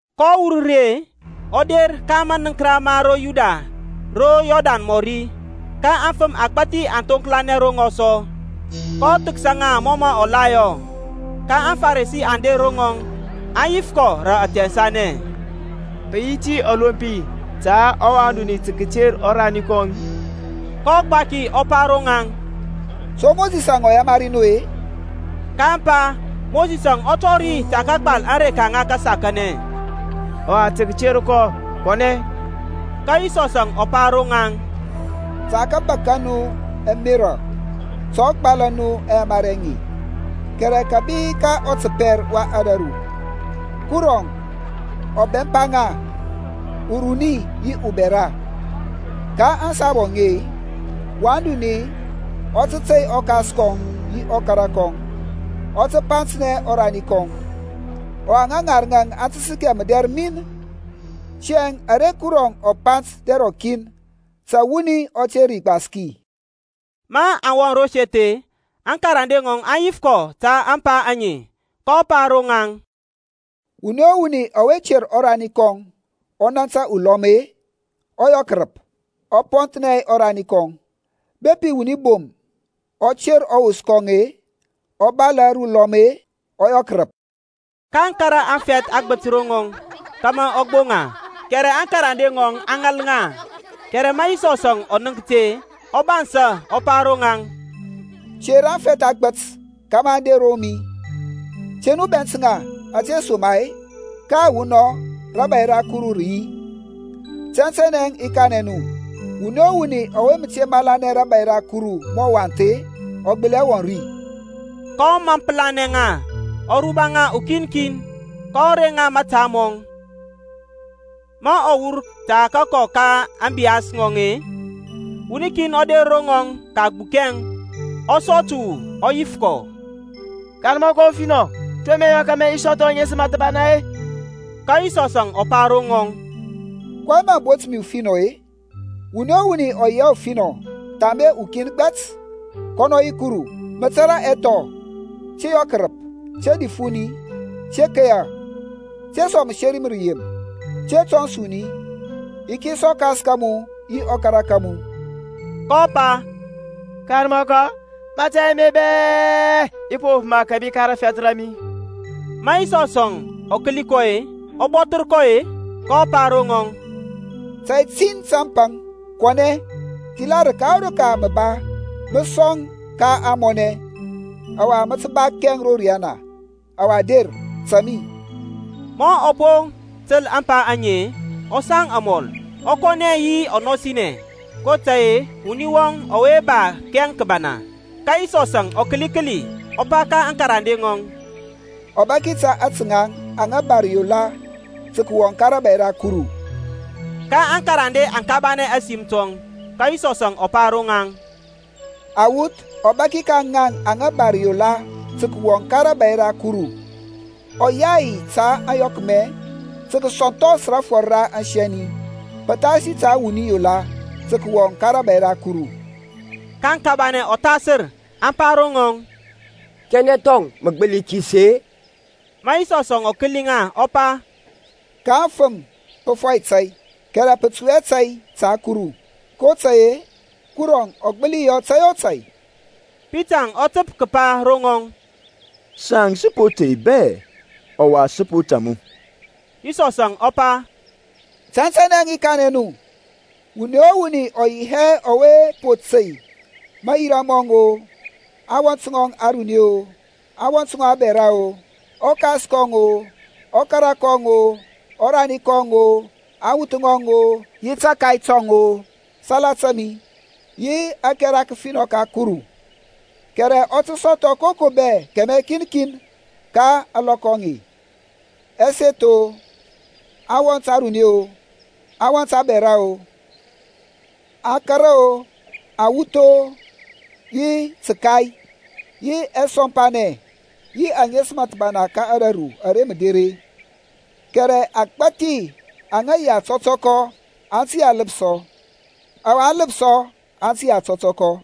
kɔ wur ri-e, ɔ der ka manəŋkəra ma ro Yudia ro Yɔrdan mɔri. Ka afəm agbȧthi aŋ thoŋklanɛ ro ŋɔŋ sɔ, kɔ thəksa ŋa mɔ mɔ la yɔ. Ka aŋFarisi aŋ der ro ŋɔŋ, aŋ yif kɔ rə athɛnsanɛ, Pə yi ti ɔlompi ta wan duni tə kəter ɔrani kɔŋ-i? kɔ gbaki ɔ pa ro ŋaŋ, To Mosisȧŋ ɔ yamari nu-e? kaŋ pa, Mosisȧŋ ɔ tɔri tə kəgbal areka ŋa kəsakanɛ, ɔwa tə kəter kɔ kɔnɛ. Ka Yisɔsȧŋ ɔ pa ro ŋaŋ, Ta kabak ka nu ɛmerȧ tə ɔ gbala nu aŋyamari aŋe. Kɛrɛ kȧbi ka ɔtəpɛr wa ȧdȧru-e Kurɔŋ ɔ bɛmpa ŋa, uruni yi ubɛra. Ka ȧŋsabu aŋe, wan duni ɔ tə tey ɔkas kɔŋ yi ɔkara kɔŋ, ɔ tə gbapsa ɔrani kɔŋ; ɔwa ŋa ŋarəŋȧŋ aŋ tə səkɛ mədɛr min. Tiyȧŋ ara Kurɔŋ ɔ pant dɛr rɔkin, ta wuni ɔ te ri gbaski. Maŋ wɔŋ ro seth-e, aŋkarande ŋɔŋ aŋ yif kɔ ta ȧŋpa aŋe. kɔ pa ro ŋaŋ, Wuni o wuni ɔwe ter ɔrani kɔŋ, ɔ nȧntȧ ulɔm-e, ɔ yɔ kərəp, ɔ pɔnthnɛ ɔrani kɔŋ. Bepi wuni bom ɔ ter ɔwos kɔŋ-e, ɔ balȧ rə ulɔm-e, ɔ yɔ kərəp. kaŋ kȧrȧ afɛth agbət ro ŋɔŋ, kȧmȧ ɔ gboŋ ŋa, kɛrɛ aŋkarande ŋɔŋ aŋ ŋal ŋa. Kɛrɛ ma Yisɔsȧŋ ɔ nənk ti-e, ɔ bansȧ, ɔ pa ro ŋaŋ, Ter aŋfɛth agbət kȧmȧ aŋ der ro mi; te nu bɛnt ŋa, ȧtesoma-e, ka awunɔŋ rȧbȧy ra Kuru rə yi. Tɛntɛnɛ i kanɛ nu, Wuni o wuni ɔwe mə te malanɛ rȧbȧy ra Kuru mɔ uwath-e, ɔgbəli hɛ wɔŋ ri. kɔ mampəlanɛ ŋa, ɔ ruba ŋa ukin kin, kɔ reŋ ŋa mȧta mɔŋ. Ma ɔ wur tə kəkɔ ka ȧŋbiyas ŋɔŋ-e, wuni kin ɔ der ro ŋɔŋ kəgbukɛŋ, ɔ sɔ təwu, ɔ yif kɔ, Karmɔkɔ ufinɔ, to mə i yɔ kȧmȧ i sɔthɔ aŋesəm thəbana-e? Ka Yisɔsȧŋ ɔ pa ro ŋɔŋ, kɔyɛŋ mə bont mi ufinɔ-e? Wuni o wuni ɔ yi hɛ ufinɔ thambe ukin gbɛt, kɔnɔ yi Kurɔŋ. Mə tȧrȧ ɛthɔ, Te yɔ kərəp, te dif wuni, te keya, te sɔŋ məseri ma rəyem, te tɔns wuni, yikis ɔkas ka mu yi ɔkara ka mu. kɔ pa, Karmɔkɔ, mȧtȧy ame bɛ i po wop kȧbi ka rafɛth ra mi. Ma Yisɔsȧŋ ɔ kəli kɔ-e, ɔ bɔthər kɔ-e, kɔ pa ro ŋɔŋ, Tȧy tin tə mə paŋ; kɔnɛ, thila rəka o rəka ara mə ba, mə sɔŋ ka ȧŋmɔnɛ, ɔwa mə tə ba kɛŋ ro riyana; ɔwa der, tȧŋ mi. Ma ɔ po təl mapa ame-e, ɔ saŋ amɔl, ɔ kɔnɛ yi ɔnɔsinɛ, kotȧy-e wuni wɔŋ ɔwe ba kɛŋ kəbana. Ka Yisɔsȧŋ ɔ kəli kəli, ɔ pa ka aŋkarande ŋɔŋ, Ɔbaki ta ȧtȧ ŋaŋ aŋa ba rəyola tə kəwɔŋ ka rȧbȧy ra Kuru! Ka aŋkarande aŋ kabanɛ ȧsim tɔŋ. Ka Yisɔsȧŋ ɔ pa ro ŋaŋ, Awuth, ɔbaki ka ŋaŋ aŋa ba rəyola tə kəwɔŋ ka rȧbȧy ra Kuru! Ɔyay ta ȧyɔkmɛ tə kəsɔnthɔs rafɔr ra asɛni, pəthasi ta wuni yola tə kəwɔŋ ka rȧbȧy ra Kuru! kaŋ kabanɛ ɔthasər, aŋ pa ro ŋɔŋ, Kanɛ thɔŋ mə gbəli kisi-e? Ma Yisɔsȧŋ ɔ kəli ŋa ɔ pa, Ka aŋfəm pə fɔyɛ tȧy, kɛrɛ pə tui hɛ tȧy ta Kuru, kotȧy-e Kurɔŋ ɔ gbəli yɔ tȧy o tȧy. Pitaŋ ɔ təp kəpa ro ŋɔŋ, Saŋ sə po tey bɛ, ɔwa sə po tȧŋ mu. Yisɔsȧŋ ɔ pa, Tɛntɛnɛ i kanɛ nu, Wuni o wuni ɔ yi hɛ ɔwe po tey mayira mɔŋ-o, awɔnt ŋɔŋ aruni-o, awɔnt ŋɔŋ abɛra-o, ɔkas kɔŋ-o, ɔkara kɔŋ-o, ɔrani kɔŋ-o, awuth ŋɔŋ-o, yi tȧkay tɔŋ-o, salata mi, yi ȧkɛra kəfinɔ ka Kuru, kɛrɛ ɔ tə sɔthɔ ka koko bɛ kɛmɛ kin kin ka ȧŋlɔkɔ aŋe, ɛseth-o, awɔnt aruni-o, awɔnt abɛra-o, akara-o, awuth-o, yi təkai, yi ɛsɔmpanɛ; yi aŋesəm thəbana ka ȧdȧru ara mə der-e. Kɛrɛ agbȧthi aŋa yi aŋtɔtɔkɔ aŋ tə yi aləpsɔ, ɔwa aŋləpsɔ aŋ tə yi ȧtɔtɔkɔ.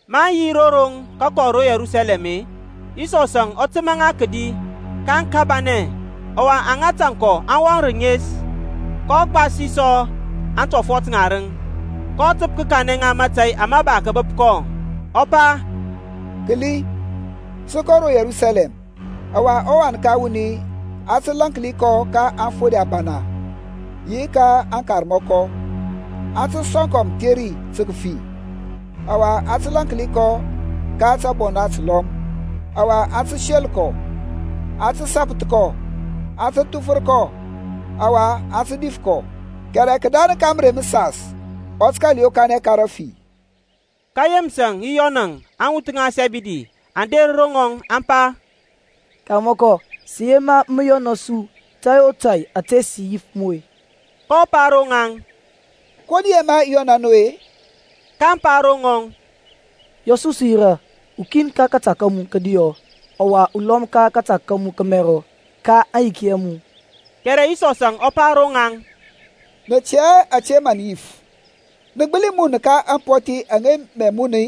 Maŋ yi ro roŋ kəkɔ ro Yerusalɛm-e, Yisɔsȧŋ ɔ təmȧ ŋa kədi; kaŋ kabanɛ, ɔwa aŋa tȧŋ kɔ aŋ wɔŋ rənes. Kɔ gbasi sɔ aŋtɔfɔt ŋarəŋ, kɔ təp kəkanɛ ŋa mȧtȧy ama ba kəbəp kɔ, ɔ pa, Kəli, sə kɔ ro Yerusalɛm, ɔwa ɔWan ka wuni, a tə lȧnki kɔ ka aŋfode abana yi aŋkarmɔkɔ; aŋ tə sɔŋ kɔ mətheri tə kəfi, ɔwa aŋ tə lȧnki kɔ ka tȧbona təlɔm. Ɔwa aŋ tə sel kɔ, aŋ tə sapəth kɔ, aŋ tə thufər kɔ, ɔwa aŋ tə dif kɔ. Kɛrɛ kədarəŋ ka mərey məsas ɔ tə kȧl yokanɛ ka rafi. Ka Yeməsȧŋ yi Yɔnȧŋ, aŋwuth ŋa Sɛbidi, aŋ der ro ŋɔŋ, aŋ pa, Karmɔkɔ, sə yema mə yɔna su tȧy o tȧy ȧte sə yif mu. kɔ pa ro ŋaŋ, Ko nə yema i yɔna nu-e? kaŋ pa ro ŋɔŋ, Yɔ su sə yirȧ, ukin ka kȧta ka mu kədiɔ, ɔwa ulɔm ka kȧta ka mu kəmɛrɔ ka aŋyiki a mu. Kɛrɛ Yisɔsȧŋ ɔ pa ro ŋaŋ, Nə tɛ hɛ ȧte mə nə yif. Nə gbəli mun ka ampɔthi aŋa mə i muna-i?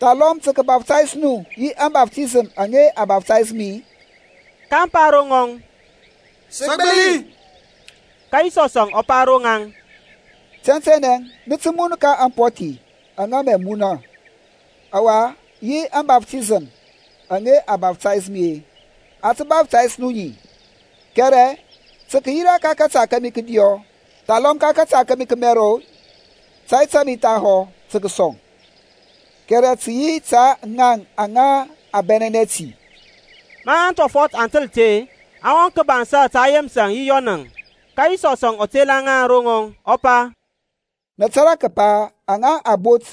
Thalɔm tə kəbaptais nu yi ȧŋbaftisəm aŋa a baftaysȧ mi-i? kaŋ pa ro ŋɔŋ, Sə gbəli. Ka Yisɔsȧŋ ɔ pa ro ŋaŋ, Tɛntɛnɛ nə tə mun ka ampɔthi aŋa mə i muna; ɔwa yi ȧŋbaftisəm aŋa a baftaysȧ mi-e a tə baftaysȧ nu ŋi. Kɛrɛ tə kəyira ka kȧta kȧmi kədiɔ, thalɔm ka kȧta kȧmi kəmɛrɔ-e, tȧy ta mi thahɔ tə kəsɔŋ, kɛrɛ tə yi ta ȧtȧ ŋaŋ aŋa a bɛnɛnɛ ti. Ma aŋtɔfɔt aŋ təl ti-e, aŋ wɔŋ kəbansa ta Yeməsȧŋ yi Yɔnȧŋ. Ka Yisɔsȧŋ ɔ tela ŋa ro ŋɔŋ, ɔ pa, Nə tȧrȧ kəpa aŋa a bot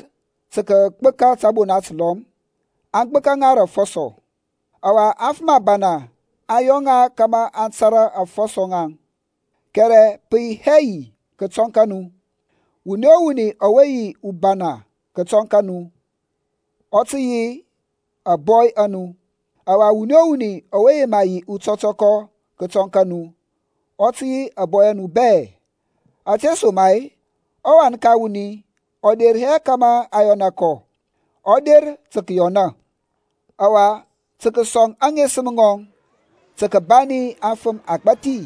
tə kəgbəka tȧbona təlɔm, aŋ gbəka ŋa rə afɔsɔ, ɔwa aŋfəm abana aŋ yɔ ŋa kȧmȧ aŋ tȧrȧ aŋfɔsɔ ŋaŋ; kɛrɛ pə yi hɛ yi kətɔŋ ka nu. Wuni o wuni ɔwe yi ubana kətɔŋ ka nu, ɔ tə yi ȧŋbɔy a nu, ɔwa wuni o wuni ɔwe yema yi utɔtɔkɔ kətɔŋ ka nu, ɔ tə yi ȧbɔy a nu bɛ. Ȧtesoma-e ɔWan ka wuni ɔ der hɛ kȧmȧ a yɔna kɔ, ɔ der tə kəyɔna, ɔwa tə kəsɔŋ aŋesəm ŋɔŋ tə kəbani afəm agbȧthi.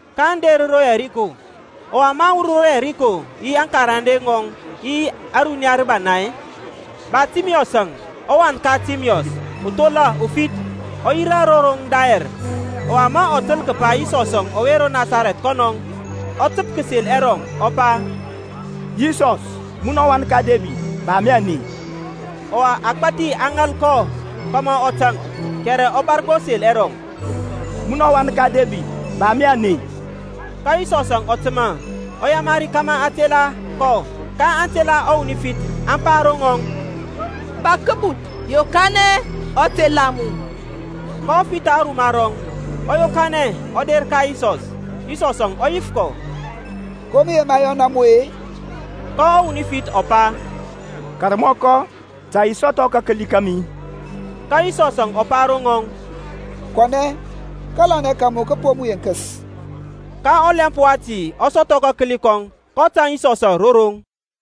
kaŋ der ro Yɛriko. Ɔwa ma ɔ wur ro Yɛriko yi aŋkarande ŋɔŋ yi ȧruniya rəbana, Bartimiyɔsȧŋ, ɔwan ka Timiyɔs, uthola ufith, ɔ yirȧ ro roŋ dayɛr. Ɔwa ma ɔ təl kəpa Yisɔsȧŋ ɔwe ro Nasarɛth kɔnɔŋ, ɔ təp kəsel ɛrɔŋ, ɔ pa, Yisɔs, munɔ ɔwan ka Debid, ba mi aney. Ɔwa agbath aŋ ŋal kɔ kȧmȧ ɔ taŋk, kɛrɛ ɔ bȧr gbo sel ɛrɔŋ, Munɔ ɔwan ka Debid, ba mi ȧney. Ka Yisɔsȧŋ ɔ təmȧ, ɔ yamari kȧmȧ aŋ tela kɔ. Kaŋ tela ɔwuni ufith, aŋ pa ro ŋɔŋ, Bȧk kəbuth, yokanɛ, ɔ tela mu. kɔ fitha aruma rɔŋ, ɔ yokanɛ, ɔ der ka Yisɔs. Yisɔsȧŋ ɔ yif kɔ, Ko mə yema i yɔna mu-e? Ka ɔwuni ufith ɔ pa, Karmɔkɔ, ta i sɔthɔ kakəli kȧmi. Ka Yisɔsȧŋ ɔ pa ro ŋɔŋ, Kɔnɛ, kȧlanɛ ka mu kə po mu yenkəs. Ka ɔlɛmp wati ɔ sɔthɔ kakəli kɔŋ, kɔ tȧŋ Yisɔsȧŋ ro roŋ.